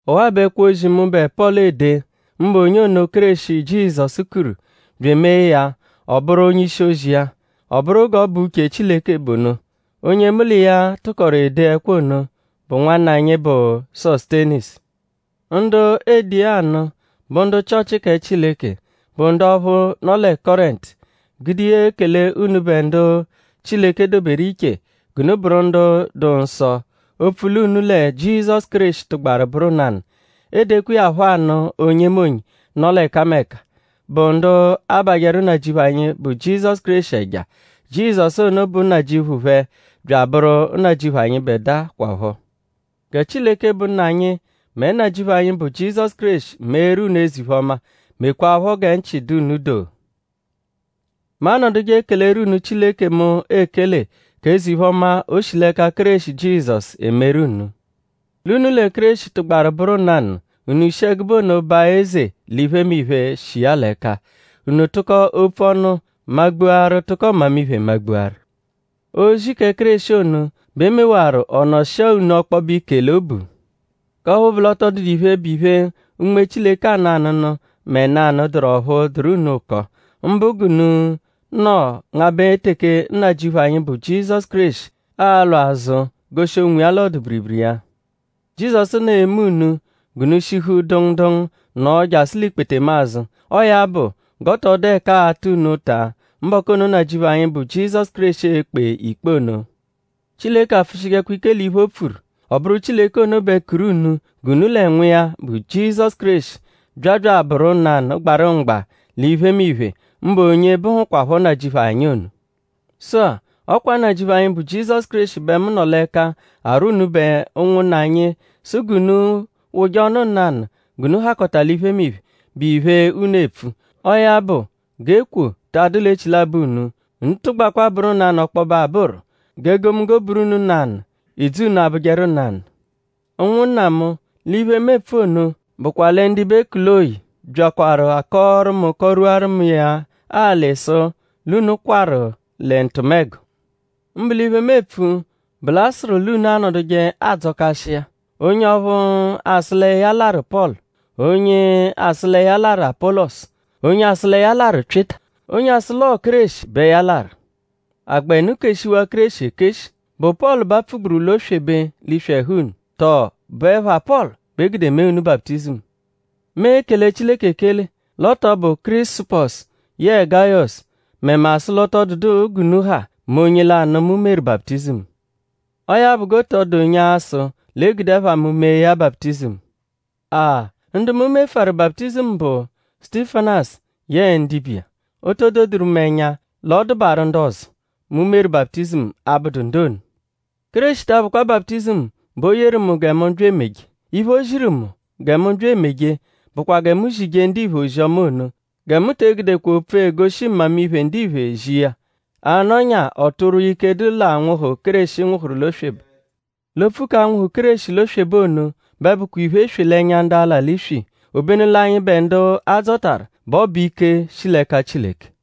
Ọwaa bụ ẹkwo-ozi, mụbe Pọlu ede; mbụ onye ono, Kéreshi Jizọsu kuru bya emee ya ọ bụru onye-ishi-ozi iya. Ọ bụru g'ọ bụ uche Chileke bụ ono. Onye mu l'iya tụkoru ede ẹkwo ono bụ nwanna anyi, bụ Sosutenisu. Ndu eede iya anụ bụ ndu Chịochi kẹ Chileke, bụ ndu ọphu nọ lẹ Kọrentu; gude iya ekele unubẹ ndu Chileke doberu iche g'unu bụru ndu dụ nsọ opfu l'unu lẹ Jizọsu Kéreshi tụgbaru bụru nanụ. Eedekwa iya phọ anụ onyemonye, nọ l'ẹkameka, bụ ndu abajẹru Nnajịuphu anyi, bụ Jizọsu Kéreshi ẹja. Jizọsu ono bụ Nnajịuphu phẹ bya abụru Nnajịuphu anyịbedua kwaphọ. Gẹ Chileke, bụ Nna anyi; mẹ Nnajịuphu anyi, bụ Jizọsu Kéreshi meeru unu eze-iphe-ọma; mekwaaphọ gẹ nchị dụ unu doo. Mu anọduje ekeleru unu Chileke mu ekele k'eze-iphe-ọma, o shi l'ẹka Kéreshi Jizọsu emeru unu. L'unu lẹ Kéreshi tụgbaru bụru nanụ; unu shi ẹgube ono baa eze l'iphemiphe, shi iya l'ẹka. Unu tụko opfu ọnu magbuaru tụko mmamiphe magbuaru. Ozi kẹ Kéreshi ono bẹ e mewaru ọ nọshia unu ọkpobe ike l'obu; k'ọphu bụ l'ọ tọ dụdu iphe, bụ iphe Unme Chileke anụ anụnu mẹ nanụ, dụru ọphu dụru unu ụko; mbụ g'unu nọ ngabẹ teke Nnajịuphu anyi, bụ Jizọsu Kéreshi a-lwa azụ goshi onwiya l'ọdu-biribiri iya. Jizọsu ono e-me unu g'unu shihu dụngu dụngu nno jasụ l'ikpetemazụ. Ọo ya bụ; g'ọ tọ dụ ẹka aata unu ụta mbọku ono, Nnajịuphu anyi, bụ Jizọsu Kéreshi e-kpe ikpe ono. Chileke apfụshijekwa ike l'iphe, o pfuru. Ọ bụru Chileke ono bẹ kuru unu g'unu lẹ Nwa iya, bụ Jizọsu Kéreshi bya bya abụru nanụ gbarụ mgba l'iphemiphe; mbụ onye bụhukwapho Nnajịuphu anyi ono. Sụ-a; ọ kwa Nnajịuphu anyi, bụ Jizọsu Kéreshi bẹ mu nọ l'ẹka arwọ unubẹ ụnwunna anyi sụ g'unu wụje ọnu nanụ g'unu hakọta l'iphemiphe, bụ iphe unu epfu. Ọo ya bụ g'ekwo ta adụ l'echilabọ unu. Unu tụgbakwa bụru nanụ ọkpobe abụru. G'egomunggo bụru unu nanụ; idzu unu abụjeru nanụ. Ụnwunna mu; l'iphe, mu epfu ono bụkwa lẹ ndibe Kuloyi byaakwaru akọoru mu kọ-rwuaru mu iya alị sụ l'unu kwarụ lẹ ntụmego. Mbụ l'iphe, mu epfu bụ l'a sụru l'unu anọduje adzọkashi iya. Onye ọphu asụ lẹ ya larụ Pọlu; onye asụ lẹ ya larụ Apọlosu; onye asụ lẹ ya larụ Pyịta; onye asụ l'ọo Kéreshi bẹ ya larụ. ?A gbẹnu keshiwaa Kéreshi ekeshi??Bụ Pọlu bẹ apfugburu l'oswebe l'iswi ẹhu unu? Tọo?bụ ẹpha Pọlu bẹ e gude mee unu baputizimu? Mu ekele Chileke ekele l'ọ -tọ bụ Kirisupọsu yẹe Gayọsu mẹ mu asụ l'ọ tọ dụdu g'unu ha mẹ onye lanụ mu meru baputizimu. Ọo ya bụ g'ọ tọ dụ onye a-sụ l'e gude ẹpha mu mee ya baputizimu. Aa! Ndu mu mefụaru baputizimu bụ Sutifanasu yẹe ndibe iya. O to doduru mu ẹnya l'ọ dụbaaru ndu ọzo, mu meru baputizimu abụdu ndu ono. Kéreshi ta abụkwa baputizimu bẹ o yeru mu gẹ mu bya emeje. Iphe, o ziru mu gẹ mu bya emeje bụkwa gẹ mu zije ndiphe ozi-ọma ono. Gẹ mu te egudekwa opfu, egoshi mmamiphe ndiphe zi iya; a -nọnyaa ọ tụrwua ike, dụ l'anwụhu, Kéreshi nwụhuru l'oswebe. L'opfu k'anwụhu Kéreshi l'oswebe ono bẹ bụkwa iphe-eswe l'ẹnya ndu ala l'iswi; obenu l'anyịbe ndu a dzọtaru bẹ ọ bụ ike, shi l'ẹka Chileke.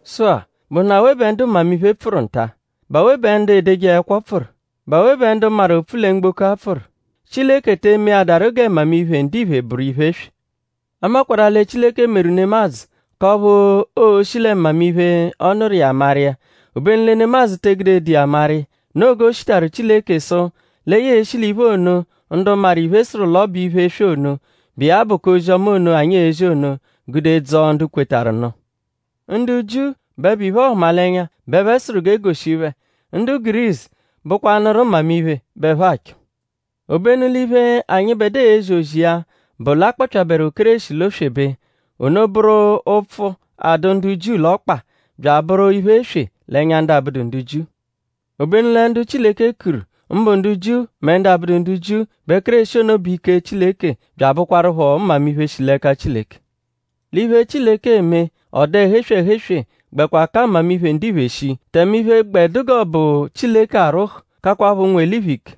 Sụ-a;?bụhunu awe bẹ ndu mmamiphe pfụru nta??Bụ awe bẹ ndu edeje ẹkwo pfụru??Bụ awe bẹ ndu maru opfu lẹ mgboko-a pfụru??Chileke te emeadaru gẹ mmamiphe, ndiphe bụru iphe-eswe? A makwarụ-a lẹ Chileke meru nemadzụ k'ọphu oo-shi lẹ mmamiphe, ọ nụru iya maru iya; obenu lẹ nemadzụ te egudedu iya maru iya. Noo g'o shitaru Chileke sụ lẹ ya e-shi l'iphe ono, ndu maru iphe sụru l'ọ bụ iphe-eswe ono, bụ iya bụ k'ozi-ọma ono, anyi ezi ono; gude dzọo ndu kwetarụ nụ. Ndu Jiu bẹ bụ iphe-ọhumalenya bẹ ẹphe sụru g'e goshi phẹ; ndu Gurisu bụkwanuru mmamiphe bẹ ẹphe achọ. Obenu l'iphe, anyịbedua ezi ozi iya bụ l'a kpọpyaberu Kéreshi l'oswebe. Ono bụru ụpfu, adụ ndu Jiu l'ọkpa; bya abụru iphe-eswe l'ẹnya ndu abụdu ndu Jiu. Obenu lẹ ndu Chileke kuru; mbụ ndu Jiu mẹ ndu abụdu ndu Jiu; bẹ Kéreshi ono bụ ike Chileke bya abụkwarupho mmamiphe shi l'ẹka Chileke. L'iphe, Chileke eme; ọ dụ ẹhu-eswe ẹhu-eswe; gbẹkwa ka mmamiphe ndiphe shii; tẹme iphe, gbẹ dụ g'ọ bụ Chileke arwụhu kakwaphọ ụnwu-eliphe ike.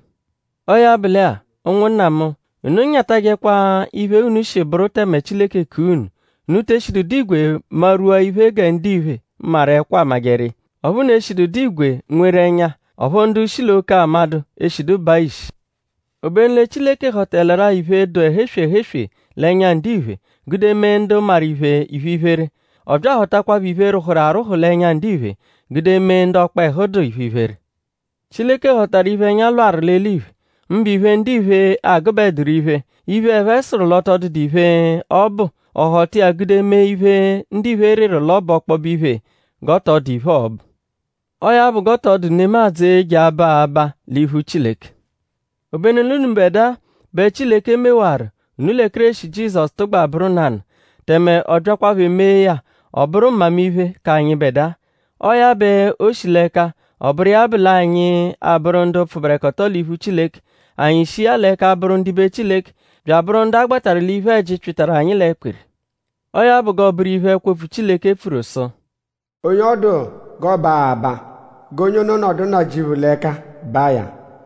Ọo ya bụ lẹ-a; ụnwunna mu; unu nyatajẹkwa iphe unu shi bụru tẹme Chileke kua unu. Unu te eshidu dụ igwe marwua iphe gẹ ndiphe, maru ẹkwo amajẹru iya; ọphu unu eshidu dụ igwe nweru ẹnya; ọphu ndu shi l'oke amadụ eshidu baa ishi. Obenu lẹ Chileke họtaleru-a iphe, dụ ẹhu-eswe ẹhu-eswe l'ẹnya ndiphe; gude mee ndu maru iphe iphe-iphere. Ọ bya ahọtakwapho iphe, rwụhuru arwụhu l'ẹnya ndiphe; gude mee ndu ọkpehu dụ iphe-iphere. Chileke họtaru iphe, ẹnya lwarụ l'eliphe; mbụ iphe, ndiphe agụbeduru iphe, iphe, ẹphe sụru l'ọ tọ dụdu iphe, ọ bụ; ọ họta iya gude mee iphe, ndiphe rịru l'ọ bụ ọkpobe iphe g'ọ tọ dụ iphe, ọo-bụ. Ọo ya bụ g'ọ tọ dụ nemadzụ, e-je aba abaa l'iphu Chileke. Obenu l'unubẹdua bẹ Chileke mewaru unu lẹ Kéreshi Jizọsu tụgba bụru nanụ; tẹme ọ byakwaphọ emee ya; ọ bụru mmamiphe k'anyịbedua. Ọo ya bẹ o shi l'ẹka; ọ bụru iya bụ l'anyi abụru ndu pfụberekoto l'iphu Chileke. Anyi shi iya l'ẹka bụru ndibe Chileke; bya abụru ndu a gbatarụ l'iphe-ẹji, pyịtaru anyi l'ẹkpiri. Ọo ya bụ g'ọo-bụru iphe, ẹkwo-opfu Chileke pfuru sụ: “Onye ọ dụ g'ọ baa abaa; g'onye ono nọdu Nnajịuphu l'ẹka ba iya.”